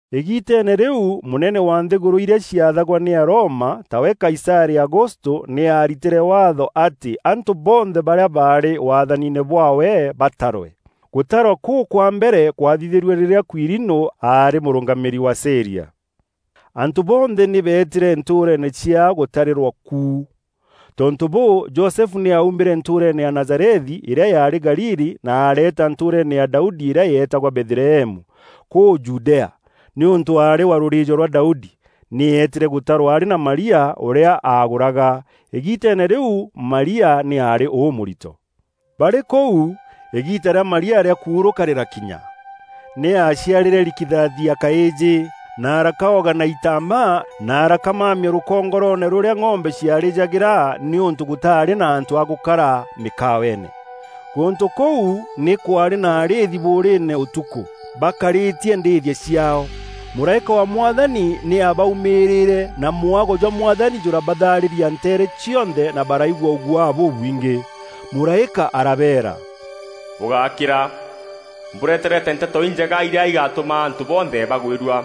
Îgiiteene rîu mûnene wa nthîgûrû irîa ciaathagwa nî Aroma, tawe Kaisarî Agustû nî aaritîre Waatho atî antû bonthe barîa baarî waathaniine bwaawe batarwe. Gûtarwa kûû kwa mbere kwathithîrue rîrîa Kuirinû aarî mûrûngamîîri wa Sîria. Antû bonthe nî beetîre ntûûreene ciaao gûtarîrwa ku. Tontû bûû, Josefu nî aumîre ntûûreene ya Nazarethi îrîa yaarî Galili na areeta ntûûreene ya Daudi îrîa yeetagwa Bethlehemu kûu Judea, nîûntû aarî wa rûrîîjo rwa Daudi. Nî eetîre gûtarwa arî na Maria, ûrîa agûraga. Îgiiteene rîu Marîa nî aarî ûmûrito. Barî kûu, îgiita rîa Maria rîa kuurûka rîrakinya. Nî aaciarîre rikithathi ya kaîjî, na arakaoga na itambaa, na arakamamia rûkongoroone rûrîa ng'ombe ciarîjagîra nîûntû gûtaarî na antû a gûkara mîkaweene. Gûntû kûu nî kwaarî na arîîthi bûûrîîne ûtukû baakarîtie ndîîthia ciaao. Mûraîka wa Mwathani nî abaumîîre na mwago jwa Mwathani jûrabathaarîra nteere cionthe na baraigua ûguaa bûbwingî. Mûraîka arabeera, “Bûgákîra! Mbûreterete Nteto Injega irîa igatûma antû bonthe bagwîrua.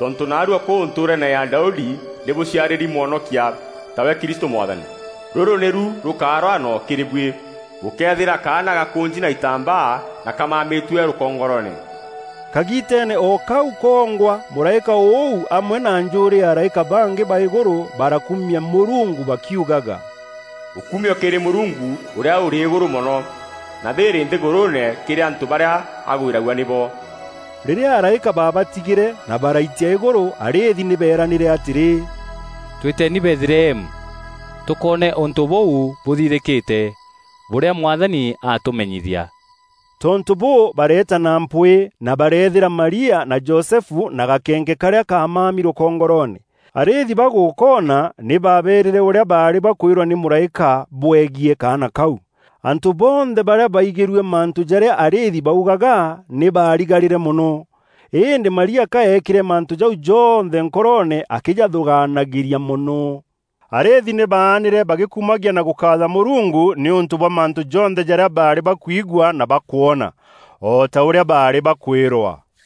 Tontû naarua kûu ntûûreene ya Daudi nî bûciarîri Mwonokia, tawe Kristû Mwathani. Rûrû nîru rûkaa rwano kîrî buî: bûkeethîra kaana gakûnji na itambaa na kamamîtue rûkongoroone.” Kagiiteene o kau kongwa mûraîka ûu amwe na njûûrî ya araîka bangî ba îgûrû barakumia Mûrungu bakiugaga, “Ûkumio kîrî Mûrungu Ûrîa Ûrî îgûrû mono, na thîîrî nthîgûrûûne kîrî antû barîa agwîragua nîbo!” Rîrîa araîka babatigîre na baraitia îgûrû, arîîthi nî beeranîre atîrî, “Twîteni Bethlehemu, tûkoone ûntû bûu bûthithîkîte, bûrîa Mwathani atûmenyithia.” Tontû bûû, bareeta na mpwîî, na bareethîra Maria na Josefu na gakeenke karîa kaamami rûkongoroone. Arîîthi bagûkoona, nî baaberîre ûrîa baarî bakwîrwa nî mûraîka bwegiî kaana kau. Antû bonthe barîa baigîrue mantû jarîa arîîthi baugaga nî baarigarîre mono. Îndî Maria ka eekîre mantû jau jonthe nkoroone akîjathûgaanagîria mono. Arîîthi nî baanîre bagîkumagia na gûkaatha Mûrungu nîûntû bwa mantû jonthe jarîa baarî bakwigua na bakwona, o ta ûrîa baarî bakwîrwa.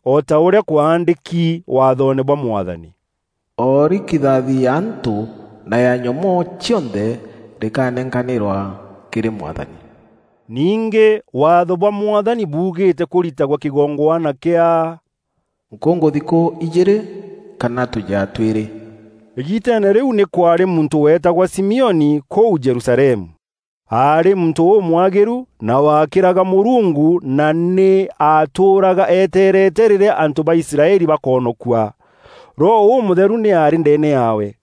o ta ûrîa kwaandîki waathoone bwa Mwathani: “O rikithathi ya antû na ya nyomoo cionthe rikanenkanîrwa kîrî Mwathani.” Ningî Waatho bwa Mwathani buugîîte kûritagwe kîgongwana kîa “Nkûngûthikû ijîîrî kana tûjea twîrî.” Îgiiteene rîu nî kwaarî muntû weetagwa Simioni kûu Jerusalemu. Aarî muntû ûmwagîru na waakîraga Mûrungu na nî aatûûraga eteerete rîrîa antû ba Israeli bakoonokua. Roho Ûmûtheru nî aarî ndeene yaawe.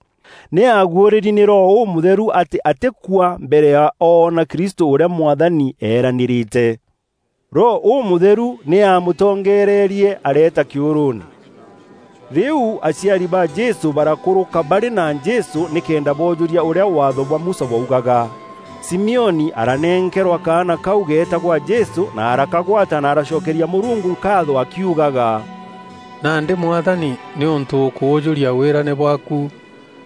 Nî aaguûrîri nî Roho Ûmûtheru atî atîkua mbere ya oona Kristû ûrîa Mwathani eeranîrîte. Roho Ûmûtheru nî amûtongererie areeta kîûrûûne. Rîu aciari ba Jesû barakûrûka barî na Jesû nîkenda boojûria ûrîa Waatho bwa Musa bwaugaga. Simioni aranenkerwa kaana kau geetagwa Jesû na arakagwata na aracokeria Mûrungu nkaatho akiugaga, “Nandî Mwathani nîûntû ûkûûjûria wîrane bwaaku,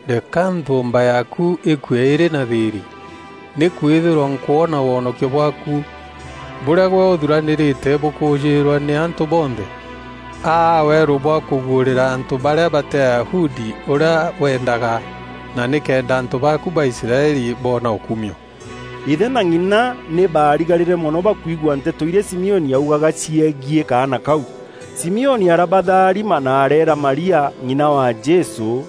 reka nthûûmba yaaku îkue îrî na thîîrî, Nîkwîthîrwa nkwona wonokio bwaaku, bûrîa gwe ûthuranîîrîte bûkûûjîîrwa nî antû bonthe. Aa weerû bwa kûguûrîra antû barîa batî Ayahudi ûrîa weendaga, na nîkenda antû baaku ba Israeli boona ûkumio.” Îthe na ng'ina nî baarigarîre mono bakwigua nteto irîa Simioni augaga ciegiî kaana kau. Simioni arabatharima na areera Maria, ng'ina wa Jesû,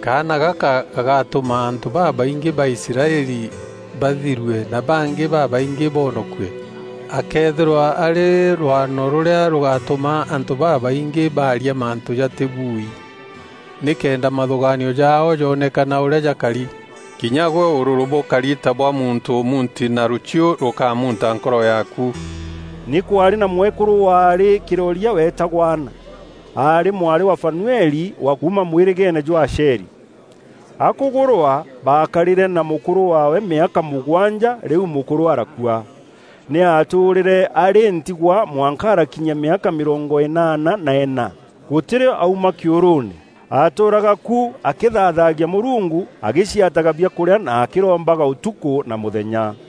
“Kaana gaka gagatûma antû babaingî ba Israeli bathirue na bangî babaingî boonokue. Akeethîrwa arî rwano rûrîa rûgatûma antû babaingî baaria mantû jatîbuui, nîkenda mathûgaanio jaao joonekana ûrîa jakari. Kinya gwe ûrûrû bûkari ta bwa muntû ûmuunti na rûchiû rûkamûnta nkoro yaaku.” Nî kwaarî na mwekûrû waarî kîroria weetagwa Ana. Aarî mwarî wa Fanueli, wa kuuma mwîrîgeene jwa Asheri. Akûgûrwa, baakarîre na mûkûrû waawe mîaka mûgwanja rîu mûkûrû arakua. Nî aatûûrîre arî ntigwa mwanka arakinyia mîaka mîrongo înaana na îna. Gûtî rîo auma kîûrûûne; aatûûraga ku akîthaathagia Mûrungu, agîciataga biakûrîa na akîrombaga ûtukû na mûthenya.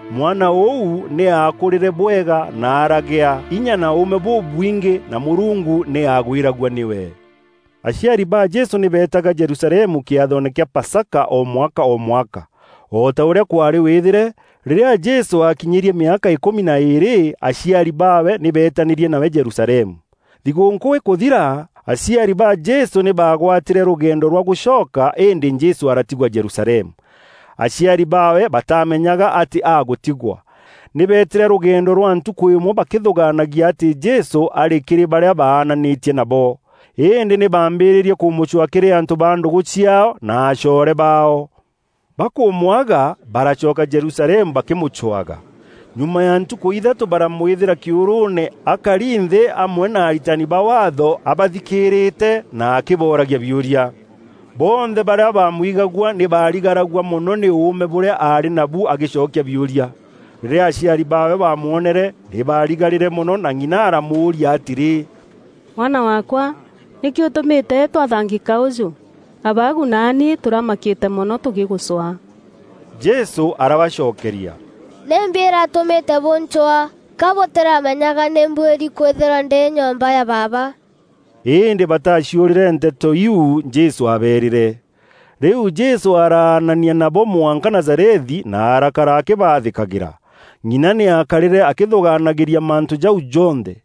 Mwana ûu nî aakûrîre bwega na aragea inya na ûûme bûbwingî na Mûrungu nî aagwîragua nîwe. Aciari ba Jesû nî beetaga Jerusalemu kîathoone kîa Pasaka o mwaka o mwaka. O ta ûrîa kwaarî wîthîre, rîrîa Jesû aakinyîrie mîaka îkûmi na îîrî, aciari baawe nî beetanîrie nawe Jerusalemu. Thigûûnkû îkûthira, aciari ba Jesû nî baagwatîre rûgendo rwa gûcoka îndî Jesû aratigwa Jerusalemu. Aciari baawe batamenyaga atî agûtigwa. Nî beetîre rûgendo rwa ntukû îmwe bakîthûgaanagia atî Jesû arî kîrî barîa baananîtie nabo. Îndî nî baambîrîrie kûmûcwaa kîrî antû ba ndûgû ciaao na acoore baao. Bakûmwaga, baracoka Jerusalemu bakîmûcwaga. Nyuma ya ntukû ithatû baramwîthîra kîûrûûne akari nthî amwe na aritani ba Waatho, abathikîîrîte na akîbooragia biûria. Bonthe barîa baamwigagua nî baarigaragua mono nî ûûme bûrîa aarî nabu agîcokia biûria. Rîrîa aciari baawe baamwonere nî baarigarîre mono na ng'ina aramûûria atîrî, “Mwana waakwa, nîkî ûtûmîte twathangîka ûjû? Abaagu naani tûramakîte mono tûgîgûcwaa.” Jesû arabacokeria, “Nîmbi îratûmîte bûncwaa? Ka bûtîramenyaga nî mbuîri kwîthîrwa ndî nyomba ya Baaba?” Îndî bataciûrîre nteto iu Jesû aabeerîre. Rîu Jesû araanania nabo mwanka Nazarethi na arakara akîbaathîkagîra. Ng'ina nî aakarîre akîthûgaanagîria mantû jau jonthe.